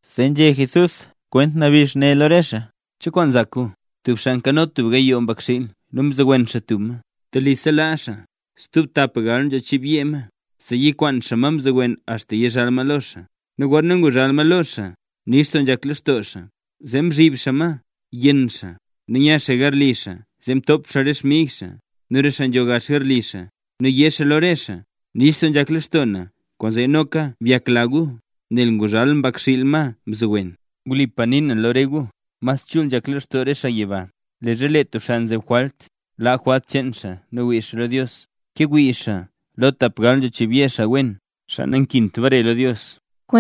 Zee nzhé Jesús kwent nabix ne lo re xaa: —¿Cho kwaan nzak gu? Tub xaa nkano tub gayoo mbakxiil nu mzowen xaa tub ma. Telisa laa xaa stub tapgal nzho chiibyee ma, zee yikwaan xaa ma mzowen axta yizhal ma lo xaa. Nu gorna nguzhal ma lo xaa, nix doo nzhak lextoo xaa zee mzhiib xaa ma yenn xaa, nu nya xaa garli xaa zee top xaa re xmig xaa nu re xaa nzho gax garli xaa nu yé xaa lo re xaa: “Nix doo nzhak lextoo na kwaanzee noka byakla gu, nel nguzhal xmbakxiil na, ma mzowen”. Nu wlipa na nii na lo re gu. Mas chul nzhak lextoo re xaa yiba, leezha lee tub xaa nzeb jwalt laa jwalt cheen xaa nu wii xaa lo Dios, ke wii xaa lo tapgal nzho chiibyee xaa wen, xaa nakint bare lo Dios.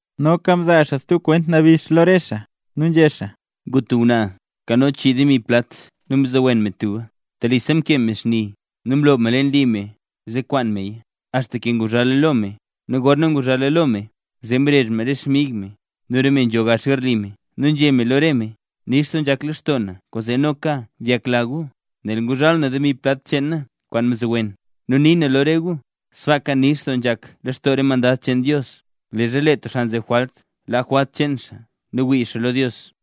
Noka mzaa xaa stub kwent nabix lo re xaa nu nzhé xaa: —Ngu tub ngwnaa nkano tub chii demi plat nu mzowen me tuba. Telisa mkee me xni, nu mloob me leen li me zee kwaan meya, axta ke nguzhala lo me. Nu gorna nguzhala lo me, zee mrezh me re xmig me nu re me nzho gax garli me nu nzhé me lo re me: “Nix doo nzhak lextoo na kwaanzee noka byakla gu, nel nguzhal na demi plat cheen na kwaan mzowen”. Nu nii na lo re gu: Sbaaka nix doo nzhak lextoo re mandad cheen Dios, leezha lee tub xaa nzeb jwalt laa jwalt cheen xaa nu wii xaa lo Dios.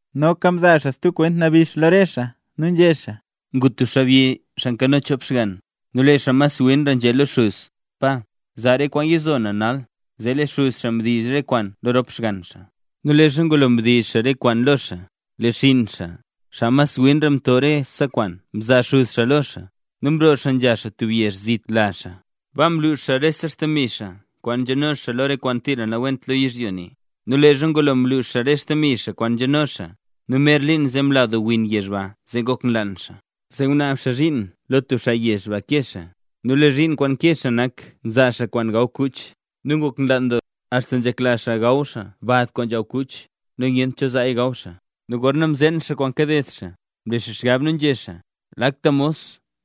Noka mzaa xaa stub kwent nabix lo re xaa nu nzhé xaa: —Ngu tub xaabyi xaa nkano chop xgann. Nu lee xaa mas winra nzhé lo xuz: “Pa, zaa re kwaan yizo na lo na nal”. Zee lee xuz xaa mdiiz re kwaan lo rop xgann xaa. Nu leezha ngulo mdiiz xaa re kwaan lo xaa, lee xinn xaa, xaa winra, mto rese kwaan mzaa xuz xaa lo xaa, nu mroo xaa nzha xaa tub yezh zit lazh xaa. Baa mlux xaa rese xdemi kwaan nzhano xaa lo re kwaan tira nawent lo yizhyo ne. Nu leezha ngulo mlux xaa rese xdemi xaa kwaan nzhano xaa, nu mer liin zee mla doo win yezh ba zee ngok nlaan xaa. Zee ngunaab xaa zhiin lo tub xaa yezh ba kee xaa. Nu lee zhiin kwaan nkee xaa nak nzaa xaa kwaan nzhaw kuch. Nu ngok nlaan doo xaa, axta nzhekla xaa gaw xaa bad kwaan nzhaw kuch, nu nyent cho zaaya gaw xaa. ’Nu gorna mzeen xaa kwaan kaded xaa, mle xaa xgab nu nzhé xaa: “Lakta mos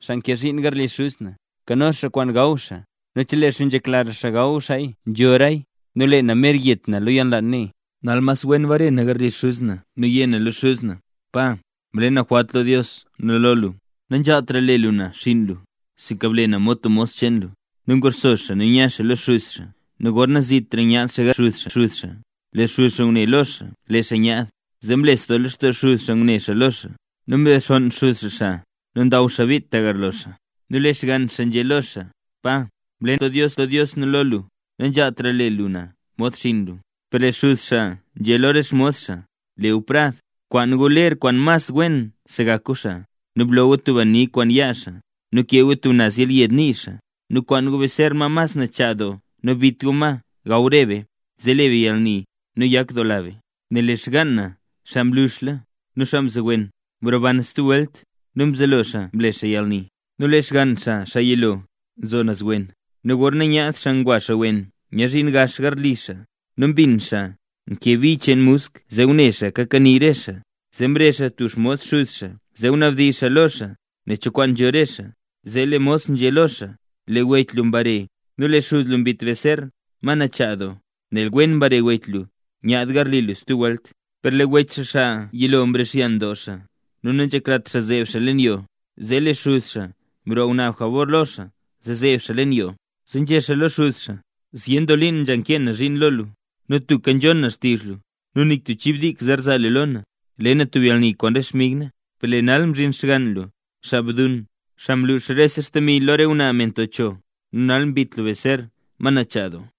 xaa nkee zhiin garli xuz na, nkano xaa kwaan nzhaw xaa nu chelee xaa nzhekla xaa gawra xaaya nzhoraya. Nu lee na mer yet na lo yalnlaan ne.” Nal mas wen bare na garli xuz na nu yé na lo xuz na: “Pa, mle na jwalt lo Dios nu lo lu. Nanzhaaltra le lu na xinn lu, sinka ble na mod tub mos cheen lu.” ’Nu nguxso xaa nu nya xaa lo xuz xaa nu gorna zitra nyaad xaa garli xuz xaa, lee xuz xaa ngune lo xaa lee xaa nyaad, zee mlesdoo lextoo xuz xaa ngune xaa lo xaa. Nu mdexonn xuz xaa xaa nu ndaw xaa bit tagarlo xaa. Nu lee xgann xaa nzhé lo xaa: “Pa, mle na jwalt lo Dios nu lo lu, nanzhaaltra le lu na mod xinn lu”. Per lee xuz xaa nzhé lo re xmos xaa: “Le gu prad, kwaan gu ler kwaan mas wen segak gu xaa, nu bloo gu tub ani kwen yaa xaa nu bkee gu tub naz yelyed nii xaa. Nu kwaan gu beser ma mas nachaa doo nu bit gu ma gaw re be, zee le be yalni nu yakdoola be. Nel lee xgaan na xaa mluxla nu xaa mzowen, mroban stub welt.” Nu mzelo xaa mle xaa yalni. ’Nu lee xgann xaa, xaa yilo, nzo naz wen, nu gorna nyaad xaa ngwa xaa wen nyaadzhin gax xaa garli xaa, nu mbin xaa nkee bi cheen musk zee ngune xaa kakanii re xaa. Zee mrezh xaa tub xmos xuz xaa zee ngunabdizh xaa lo xaa nen cho kwaan nzho re xaa. Zee lee mos nzhé lo xaa: “Lee wech lu mbare nu lee xuz lu mbit beser, ma nachaa doo, nel wen mbare wech lu nyaad garli lu stub welt”. ’Per lee wech xaa xaa yilo mrixyan doo xaa nu nanzheklat xaa zeeb xaa leen yoo. Zee lee xuz xaa mroo ngunaab jabor lo xaa zee zeeb xaa leen yoo. Zee nzhé xaa lo xuz xaa: “Zyen doo liin nzha nkee na zhiin lo lu, nu tubka nzhon na xtizh lu, nu nik tub chib dik zer zaa lu lo na, le na tub yalni kwaan re xmig na. Per lee nal mzhin xgann lu, xaa bduun, xaa mlux rese xdemi lu lo re ngwnaa me nto cho, nu nal mbit lu beser, ma nachaa doo.”